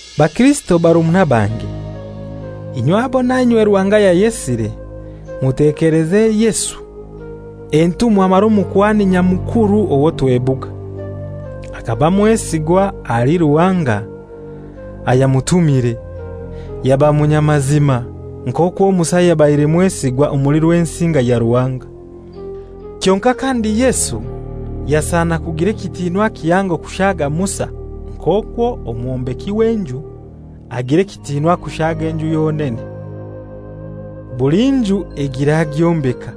Bakirisito barumuna bange, inywe abo nainywe Ruhanga yayesire! Mutekeleze Yesu, entumwa mara Omukuhani Nyamukuru owo twebuga. Akaba mwesigwa ahali Ruhanga ayamutumire, yaba munyamazima, nk'okwo Musa yabaire mwesigwa omuli Rwensinga ya Ruhanga. Kyonkai kandi Yesu yasana kugira ekitiinwa kihango kushaaga Musa, nk'okwo omwombeki w'enju agira ekitiinwa kushaaga enju yonene. (Buli nju egira agyombeka,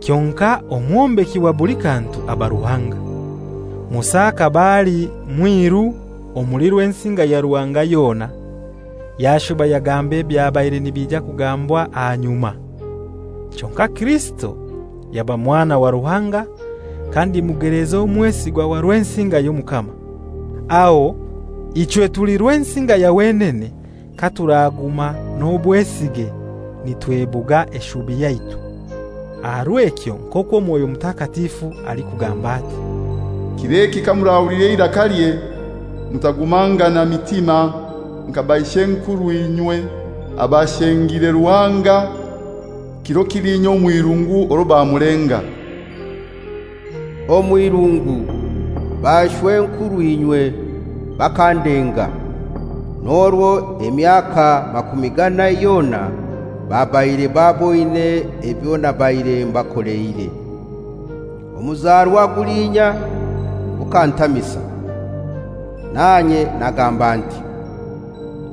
kyonkai omwombeki wa buli kantu aba Ruhanga). Musa akaba ali mwiru omuli Rwensinga ya Ruhanga yona, yashuba yagamba ebyabaire nibija kugambwa aha nyuma. Kyonkai Kirisito yaba Mwana wa Ruhanga kandi mugelezi omwesigwa wa Rwensinga y'Omukama. Aho ichwe tuli Rwensinga ya wenene katuraguma n'obwesige nitwebuga eshubi yaitu. Aha rw'ekyo nk'okwo Mwoyo Mutakatifu alikugamba ati, «Kir'eki kamurahulira eirakalye, mutakugumangana mitima nka bashw'enkurw'inywe abashengire Ruhanga kiro kiliinya omw'irungu orwo bamulenga. Omw'irungu bashw'enkurw'inywe bakandenga, n'orwo emyaka makumi ganai yona babaire baboine ebyo nabaire mbakoleire. Omuzarwa gulinya gukantamisa, nanye nagamba nti,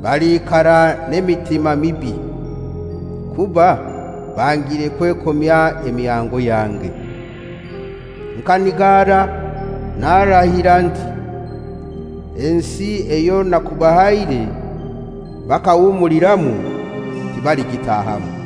‹Baliikara n'emitima mibi; kuba bangire kwekomya emihango yange.› Nkanigara narahira nti, ‹Ensi eyo nakubahaire bakahumuliramu tibaligitahamu.›»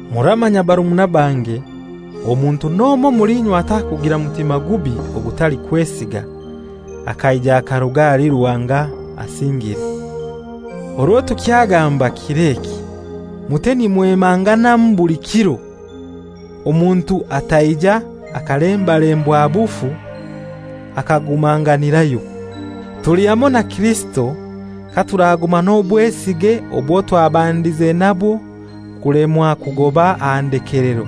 Muramanya barumuna bange, omuntu n'omoi omuli inywe atakugira mutima gubi ogutalikwesiga, akaija akaruga ahali Ruhanga asingire. Orwo tukyagamba «Kir'eki» mute nimwemanganamu buli kiro, omuntu ataija akalembalembwa bufu akagumanganirayo. Tuli hamoi na Kirisito katuraguma n'obwesige obwo twabandize nabwo kulemwa kugoba aha ndekelero.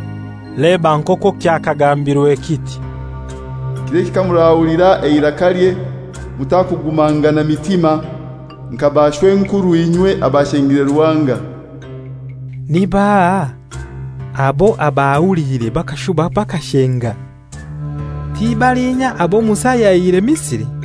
Leba nk'okwo kyakagambirwe kiti, «Kir'eki kamurahulira eirakalye mutakugumangana mitima, nka bashw'enkurw'inywe abashengire Ruhanga.» Ni baahai abo abahuliire bakashuba bakashenga? Ti balinya abo Musa yaihire Misri?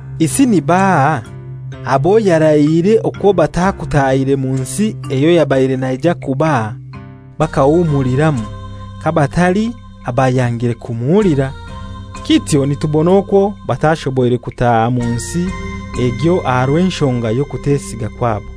Isi ni baahai abo yarahiire okwo batakutaahire mu nsi eyo yabaire naija kubaha bakahumuliramu, kabatali abayangire kumuhulira? Kityo nitubona okwo batashoboire kutaaha mu nsi egyo aha rw'enshonga y'okutesiga kwabo.